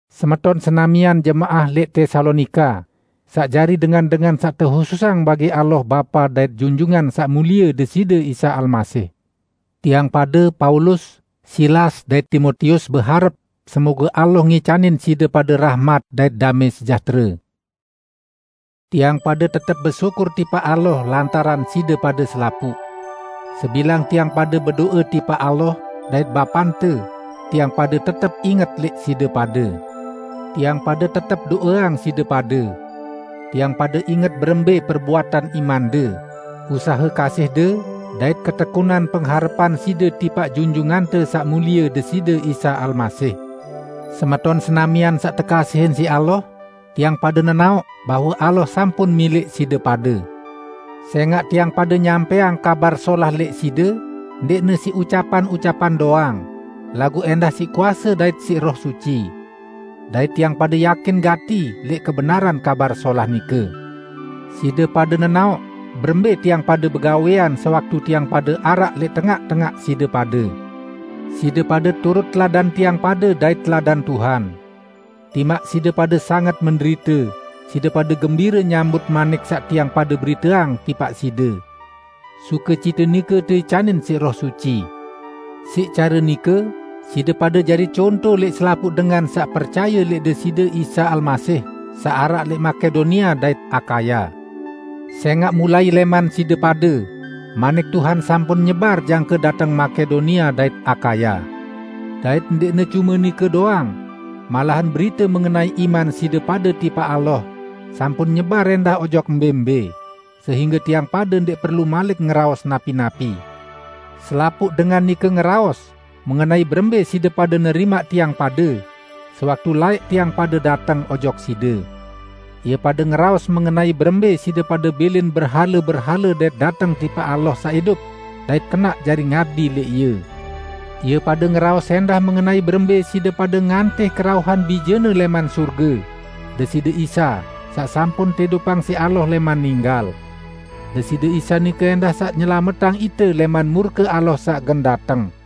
Semeton senamian jemaah lẽq Tesalonika, saq jari dengan-dengan saq tehususang bagi Allah Bapa dait Junjungan Saq Mulie Deside Isa Almasih! Tiang pade Paulus, Silas dait Timotius beharep semoge Allah ngicanin side pade rahmat dait damẽ sejahtere. Tiang pade tetep besyukur tipaq Allah lantaran side pade selapuq. Sebilang tiang pade bedo'e tipaq Allah dait Bapante, tiang pade tetep inget lẽq side pade. Tiang pade tetep do'eang side pade. Tiang pade inget berembẽ perbuatan imande, usahe kasihde dait ketekunan pengharepan side tipaq Junjungante Saq Mulie Deside Isa Almasih. Semeton senamian saq tekasihin siq Allah, tiang pade nenaoq bahwe Allah sampun milẽq side pade. Sẽngaq tiang pade nyampẽang Kabar Solah lẽq side ndẽqne siq ucapan-ucapan doang, laguq ẽndah siq kuase dait siq Roh Suci. Dait tiang pade yakin gati lẽq kebenaran Kabar Solah nike. Side pade nenaoq berembẽ tiang pade begawẽan sewaktu tiang pade araq lẽq tengaq-tengaq side pade. Side pade turut teladan tiang pade dait teladan Tuhan. Timaq side pade sanget menderite, side pade gembire nyambut manik saq tiang pade beriteang tipaq side. Sukecite nike teicanin siq Roh Suci. Siq care nike side pade jari conto lẽq selapuq dengan saq percaye lẽq Deside Isa Almasih saq araq lẽq Makedonia dait Akaya. Sẽngaq mulai lẽman side pade, manik Tuhan sampun nyebar jangke dateng Makedonia dait Akaya. Dait ndẽqne cume nike doang; malahan berite mengenai iman side pade tipaq Allah sampun nyebar ẽndah ojok mbẽ-mbẽ, sehingge tiang pade ndẽq perlu malik ngeraos napi-napi. Selapuq dengan nike ngeraos mengenai berembẽ side pade nerimaq tiang pade sewaktu laẽq tiang pade dateng ojok side. Ie pade ngeraos mengenai berembẽ side pade bilin berhale-berhale dait dateng tipaq Allah saq idup dait kenaq jari ngabdi lẽq Ie. Ie pade ngeraos ẽndah mengenai berembẽ side pade ngantih kerauhan Bije-Ne lẽman sorge, Deside Isa, saq sampun teidupang siq Allah lẽman ninggal. Deside Isa nike ẽndah saq nyelametang ite lẽman murke Allah saq gen dateng.